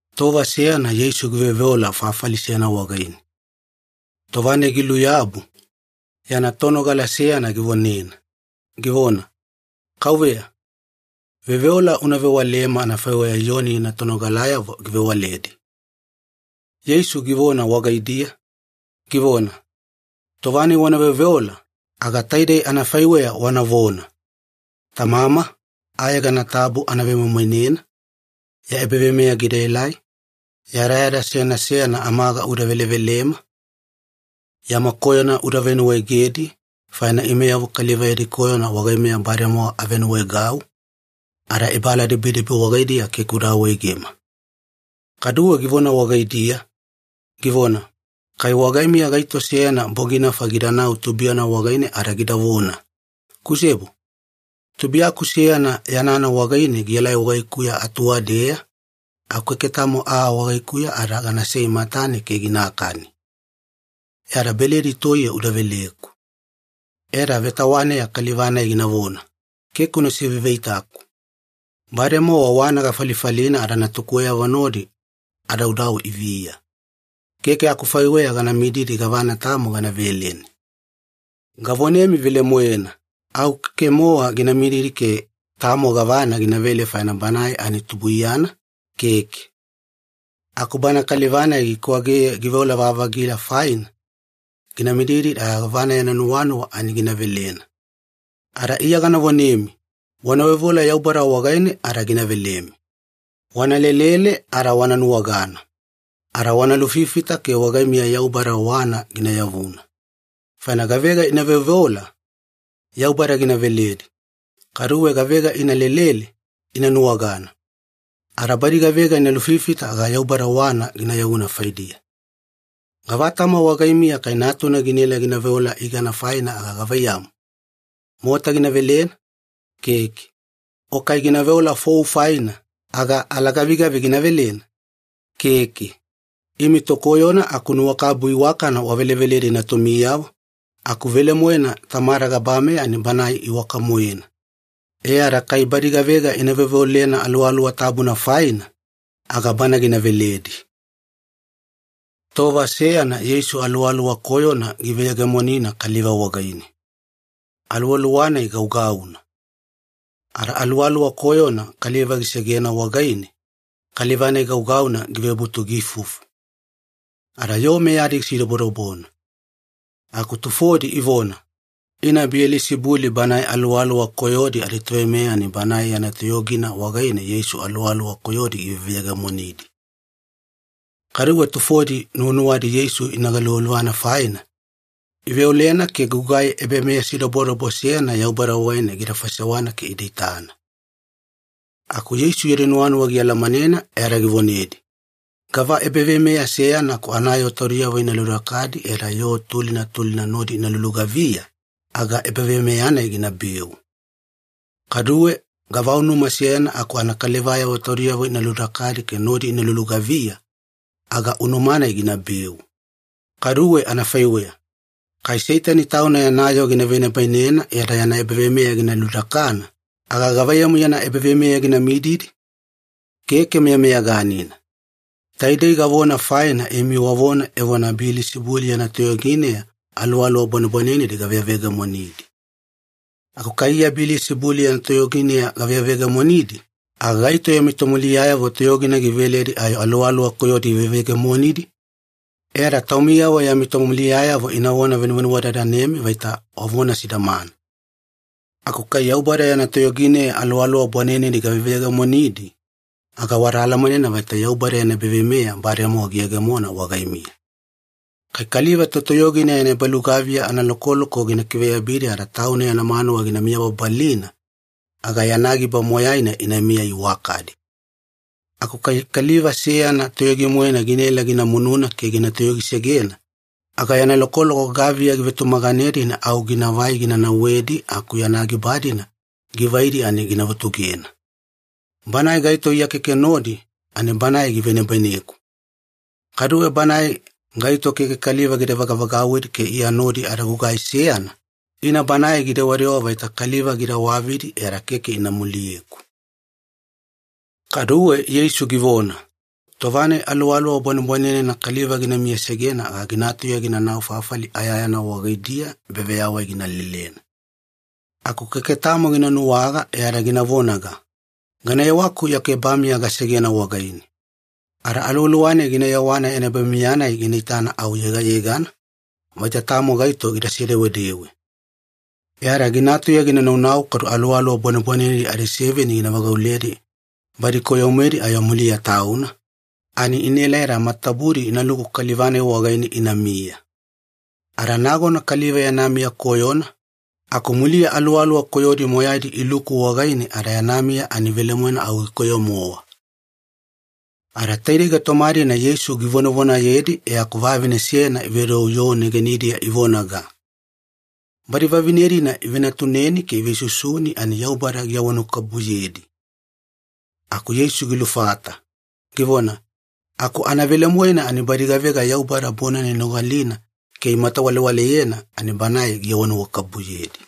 Tova seyana Yeisu giveoveola fafali seyana wagaine. Tova-nai giluyabu, yana tonogala seyana givonena, givona, “Kauveya, veoveola una vewalema anafaiweya Iyoni yana tonogalayavo givewaledi.” Yeisu givona wagaidiya, givona, “Tova-nai wana veoveola, aga taidei anafaiweya wanavona, ‘Tamama, ayegana tabu ana vemoimoinena. Ya ebaveimeya gidaelai. Yadayada seyana seyana amaga uda velevelema. Yama koyona uda venuwaegedi, faina imeyavo kaliva yadi koyona wagaimeya bademowa avenuwaegau. Ada ebaaladibidibi wagaidiya keke uda awaegema.’” Kaduwe givona wagaidiya, givona, “Kai wagaimiya gaito seyana boginafa gidanau tubuiyana wagaine ada gidavona, ‘Kusebo, tubuiyaku seyana yanana wagaine gielai wagaikuya atuwadeya, aku keke tamo aa wagaikuya ada ganasei matane ke ginakani. E ada beledi toiye uda veleku.’ “E ada vetawaneya kaliva-nai ginavona, ‘Keke una siveiveitaku. Bademowa wana falifalina ada natukuweyavo nodi adaudau iviya. Keke akufaiweya gana mididi gavana tamo gana veleni.’ “Gavonemi velemoena, au keke-mowa gina mididi ke tamo gavana ginavele faina banae ani tubuiyana, keke. Aku bana kaliva-nai gikwageye giveola-vavagila faina, gina mididi ada gavana nuwanuwana ani gina velena. Ada Iya gana vonemi, wana veoveola Yaubada wagaine ada gina velemi. Wana lelele ada wana nuwagana. Ada wana lufifita ke wagaimiya Yaubada wana gina yavuna. Faina gavega ina veoveola, Yaubada gina veledi. Kaduwe gavega ina lelele, ina nuwagana. Ada badi gavega ina lufifita aga Yaubada wana gina yavuna faidiya. “Gava tama wagaimiya kai natuna ginaela gina veola igana faina aga gavaiyamu, mota gina velena? Keke. O kai gina veola fou faina, aga alagavigavi gina velena? Keke. Imi tokoyona aku nuwakabubu iwakana waveleveledi natumiyavo, aku velemoena Tamada gabameya ani Banae iwaka-moena. E ada kai badi gavega ina veoveolena Aluwaluwa Tabuna faina, aga Bana gina veledi.” Tova seyana Yeisu aluwaluwa koyona giveyegemonina kaliva wagaine. Aluwaluwa-nai gaugauna. Ada aluwaluwa koyona kaliva gisegena wagaine, kaliva-nai gaugauna givebutu giifufu. Ada yoo meyadi gisidobodobona. Aku tufodi ivona, “Ina Biyelisibuli banae aluwaluwa koyodi aditoveimeya ani banae yana toyogina wagaine Yeisu aluwaluwa koyodi giveveyegemonidi.” Kaduwe tufodi nuwanuwadi Yeisu ina galuvaluvana faina, iveolena ke gugai ebameyasidobodobo seyana Yaubada wagaine gida faisewana ke ida itana. Aku Yeisu yadi nuwanuwa gialamanena e ada givonedi, “Gava ebaveimeya seyana aku anayoo taudiyavo ina ludakadi e ada yoo tulina tulina nodi ina lulugaviya, aga ebaveimeya-nai ginabeu. Kaduwe gava unuma seyana aku anakalivayavo taudiyavo ina ludakadi ke nodi ina lulugaviya, aga unuma-nai ginabeu. Kaduwe anafaiweya, kai Seitani tauna yana yoo gina venibainena e ada yana ebaveimeya gina ludakana, aga gavaiyamu yana ebaveimeya gina mididi? Keke meyameyaganina. Taidei gavona faina imi wavona evona Biyelisibuli yana toyogineya aluwaluwa bwanebwanenedi gaveveyegemonidi. Aku kai Iya Biyelisibuli yana toyogineya gaveveyegemonidi, aga gaito yami tomuliyayavo toyogina giveledi ayo aluwaluwa koyodi iveveyegemonidi? E ada taumiyavo yami tomuliyayavo inavona venuvenuwadadanemi vaita wavona sidamana. Aku kai Yaubada yana toyogineya aluwaluwa bwanenedi gaveveyegemonidi, aga wada alamanena vaita Yaubada yana ebaveimeya bademowa giyegemona wagaimiya. Kai kaliva totoyogina yana ebalugaviya analokoloko gina kiveyabidi ada tauna yana manuwa gina miyababalina, aga yana giba moyaina inamiya iwakadi. Aku kai kaliva seyana toyogi-moena ginaela gina mununa ke gina toyogisegena, aga yana lokoloko gaviya givetumaganedi ani au ginavai gina nauwedi aku yana giba-dina givaidi ani gina vutugena. Banae gaito Iya keke nodi, ani banae givenibaineku. Kaduwe banae gaito keke kaliva gida vagavagauwidi ke Iya nodi ada gugai seyana, ina banae gidewadewa vaita kaliva gida wavidi e ada keke ina muliyeku.” Kaduwe Yeisu givona, “Tova-nai aluwaluwa bwanebwanenena kaliva gina miyasegena aga gina tauya ginanau fafali ayayana wagaidiya ebaveyawai gina lelena. Aku keke tamo gina nuwaga e ada gina vonaga, ‘Gana yewaku yaku ebamiya gasegena wagaine.’ Ada aluwaluwa-nai gina yewana yana ebamiya-nai gina itana au yegayegana, vaita tamo gaito gida sedewedewe. E ada gina tauya ginanau kadu aluwaluwa bwanebwanenedi adiseveni gina vagauledi badi koyo-moedi ayo muliya tauna, ani inaelai ada matatabudi inaluku kaliva-nai wagaine inamiya. Ada nagona kaliva yana miya koyona, aku muliya aluwaluwa koyodi moyaidi iluku wagaine ada yana miya ani velemoena au gikoyo-mowa.” Ada taidei gaitoma-dina Yeisu givonavonayedi e aku vavine seyana ivedou yoo negenidiya ivonaga, “Badi vavine-dina ivenatuneni ke ivesusuni ani Yaubada giawanuwakabubuyedi.” Aku Yeisu gilufata, givona, “Aku anavelemoena ani badi gavega Yaubada bonana inogalina ke imatawalewaleyena, ani Banae giawanuwakabubuyedi.”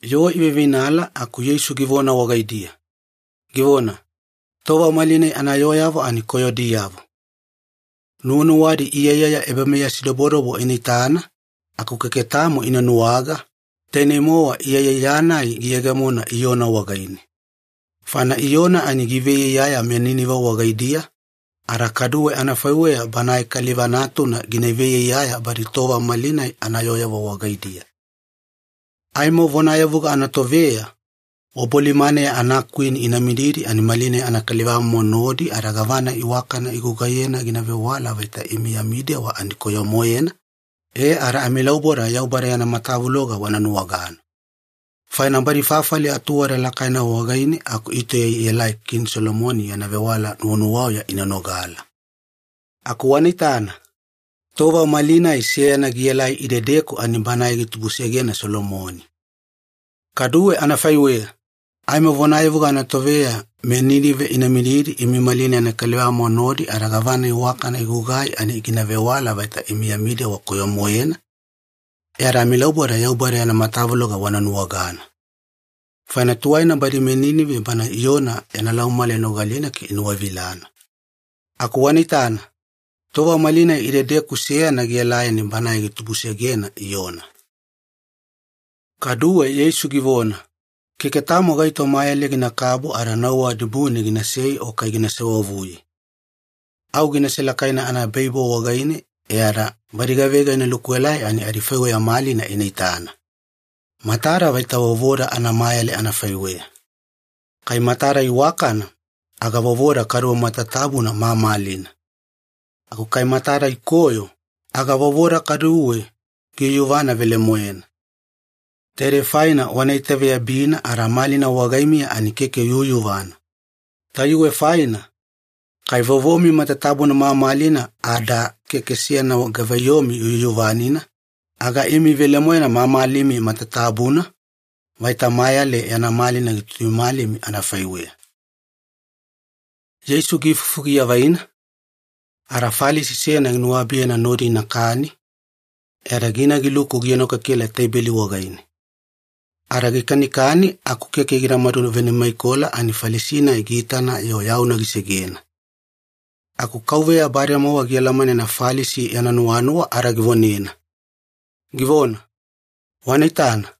Yoo iveiveinala aku Yeisu givona wagaidiya, givona, “Tova malinai anayooyavo ani koyodiyavo. Nuwanuwadi iyaiyaya ebameyasidobodobo ina itana, aku keke tamo ina nuwaga, tainei-mowa iyaiyaya-nai giyegemona Iyona wagaine. Faina Iyona ani giveiyaiyaya meNinive wagaidiya, ada kaduwe anafaiweya Banae Kaliva Natuna gina veiyaiyaya badi tova malinai anayooyavo wagaidiya. Aimo vonayavuga anatoveya, wabolimaneya anakwini ina mididi imi malinai anakalivamomo nodi ada gavana iwakana igugai ani gina vewala vaita imi yami dewa ani koyo-moena, e ada amilauboda Yaubada yana matavuloga wana nuwagana. Faina badi fafali atuwada lakaina wagaine aku itauya ielai Kini Solomoni yana vewala nuwanuwauya ina nogala. Aku wana itana, tova malinai seyana gielai idedeku ani Banae gitubusegena Solomoni. Kaduwe anafaiweya, aimo vonayavuga anatoveya meNinive ina mididi imi malinai anakalivamomo nodi ada gavana iwakana igugai ani gina vewala vaita imi yami dewa koyo-moena, e ada amilauboda Yaubada yana matavuloga wana nuwagana. Faina tuwaina badi meNinive bana Iyona yana laumamala inogalina ke inuwavilana. Aku wana itana, tova malinai idedeku seyana gielai ani Banae gitubusegena Iyona.” Kaduwe Yeisu givona, “Keke tamo gaito mayale ginakabu ada nauwa dibune ginasei o kai gina sewavuye. Au gina selakaina anaebaibo wagaine e ada badi gavega ina lukuelai ani adifaiweya malina ina itana. Matada vaita vovoda anamayale anafaiweya. Kai matada iwakana, aga vovoda kaduwe matatabuna mamalina. Aku kai matada ikoyo, aga vovoda kaduwe giyuyuvana velemoena. Taidei faina wana itaveyabina ada malina wagaimiya ani keke yuyuvana. Tayuwe faina, kai vovomi matatabuna mamalina ada keke seyana gavaiyomi yuyuvanina, aga imi velemoena mamalimi matatabuna, vaita mayale yana malina gituimalimi anafaiweya.” Yeisu giifufu giavaina, ada Falisi seyana ginuwabiyena nodi inakani, e ada gina giluku gienokekela teibeli wagaine. Ada gikanikani aku keke gidamadu venimaikola ani Falisi-nai giitana-yo yauna gisegena. Aku Kauveya bademowa gialamanena Falisi yana nuwanuwa ada givonena, givona, “Wana itana,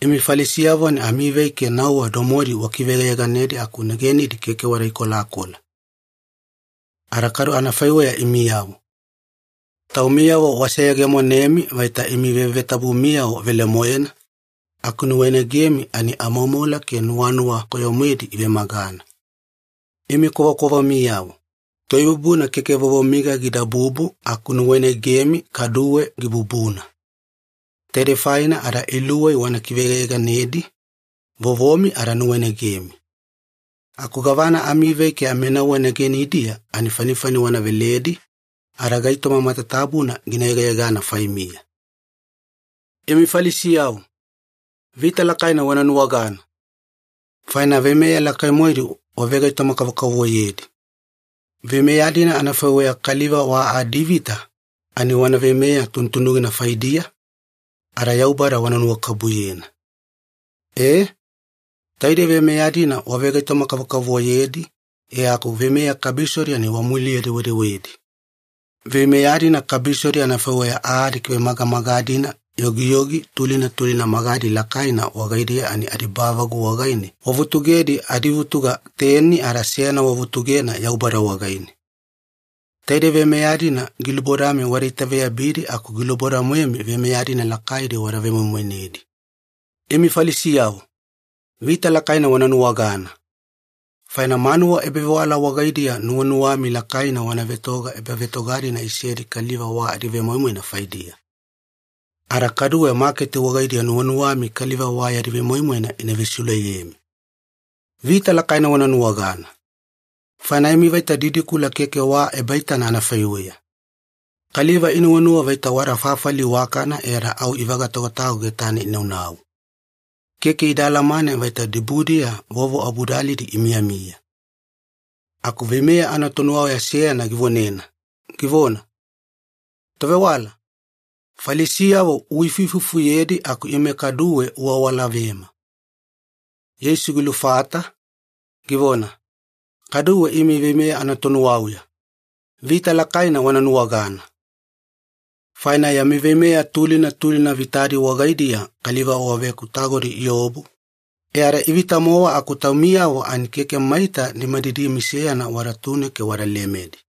imi Falisiyavo ani amivei ke nauwa domodi wakiveyegayeganedi aku negenidi keke wada ikolakola. Ada kadu anafaiweya imiyavo. Taumiyavo waseyegemonemi vaita imi vevetabumiyavo velemoena, aku nuwainagenimi ani amoumoula ke nuwanuwa koyo-moedi ivemagana. Imi kwavakwavamiyavo. Toibubuna keke vovomiga gidabubu aku nuwainagemi kaduwe gibubuna. Taidei faina ada iluwei wana kiveyegayeganedi, vovomi ada nuwainagenimi. Aku gavana amivei ke aminauwa negenidiya ani fanifani wana veledi, ada gaitoma matatabuna gina yegayegana faimiya. “Imi Falisiyavo, vita lakaina wana nuwagana! Faina veimeya lakai-moedi wavegaitoma-kavokavovoyedi. Veimeya-dina anafaiweya kaliva wa adivita ani wana veimeya tunutunugina faidiya, ada Yaubada wana nuwakabubuyena. E, taidei veimeya-dina wavegaitoma-kavokavovoyedi e aku veimeya kabisodi ani wamuliye-dewedewedi. Veimeya-dina kabisodi anafaiweya aa adikivemagamaga-dina yogiyogi tulina tulina magadi lakaina wagaidiya ani adibavagu wagaine wavutugedi adivutuga teni ada seyana wavutugena Yaubada wagaine. Taidei veimeya-dina gilubodami wada itaveyabidi aku giluboda-moemi veimeya-dina lakaidi wada vemoimoinedi. Imi Falisiyavo, vita lakaina wana nuwagana! Faina manuwa ebavewala wagaidiya nuwanuwami lakaina wana vetoga ebavetoga-dina isedi kaliva wa adivemoimoina faidiya. Ada kaduwe maketi wagaidiya nuwanuwami kaliva wa yadi vemoimoina ina vesiuleyemi. Vita lakaina wana nuwagana! Faina imi vaita didikula keke wa ebaitana anafaiweya. Kaliva inuwanuwa vaita wada fafali iwakana e ada au ivagatagotago getane inaunau. Keke ida alamane vaita dibudiya vovo abudalidi imiyamiya.” Aku veimeya anatonuwauya seyana givonena, givona, “Tovewala, Falisiyavo uifuifufuyedi aku ime kaduwe uawalavema.” Yeisu gilufata, givona, “Kaduwe imi veimeya anatonuwauya, vita lakaina wana nuwagana! Faina yami veimeya tulina tulina vitadi wagaidiya kaliva waveakutagodi iobu, e ada ivita-mowa aku taumiyavo ani keke maita nimadidimi seyana wadatune ke wada lemedi.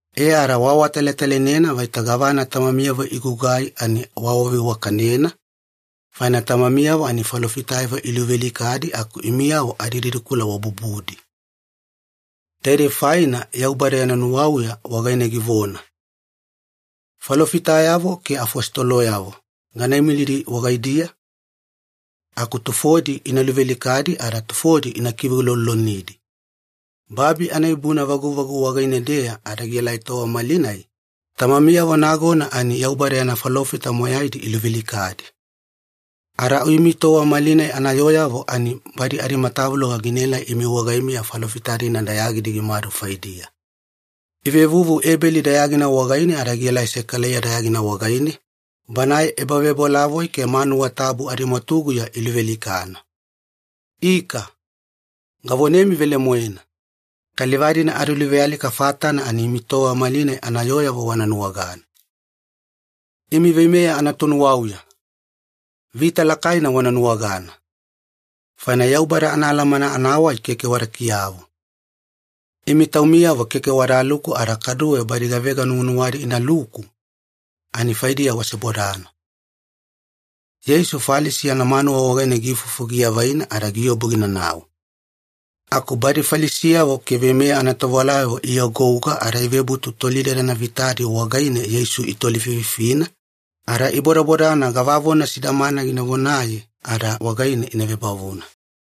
E ada waawatalatalainena vaita gavana tamamiyavo igugai ani waawaveiwakanena, faina tamamiyavo ani falofitayavo iluvealikadi aku imiyavo adididikula wabubudi. Taidei faina Yaubada yana nuwauya wagaine givona, ‘Falofitayavo ke afositoloyavo gana imilidi wagaidiya, aku tufodi ina luvealikadi ada tufodi ina kiveulolonidi.’ Babi anaibubuna vaguvagu wagaine-deya ada gielai tova malinai, tamamiyavo nagona ani Yaubada yana falofita moyaidi iluvealikadi. Ada au imi tova malinai anayooyavo ani badi adimatavuloga ginaelai imi wagaimiya falofita-dina dayagidi gimadu faidiya. Ivevuvu Ebeli dayagina wagaine ada gielai Sekalaiya dayagina wagaine, banae ebavebolavoi ke manuwa tabu adimwatuguya iluvealikana. Ika, gavonemi velemoena, kaliva-dina adiluvealika fatana ani imi tova malinai anayooyavo wana nuwagana. Imi veimeya anatonuwauya, vita lakaina wana nuwagana! Faina Yaubada anaalamana anawai keke wada kiyavu. Imi taumiyavo keke wadaluku ada kaduwe badi gavega nuwanuwadi inaluku ani faidiya wasebodana.” Yeisu Falisi yana manuwa wagaine giifufu giavaina ada giobu ginanau. Aku badi Falisiyavo ke veimeya anatovewalayavo iagouga ada ivebutu tolidadana vitadi wagaine Yeisu itolififina, ada ibodabodana gavavona sidamana gina vonaye ada wagaine ina vebavuna.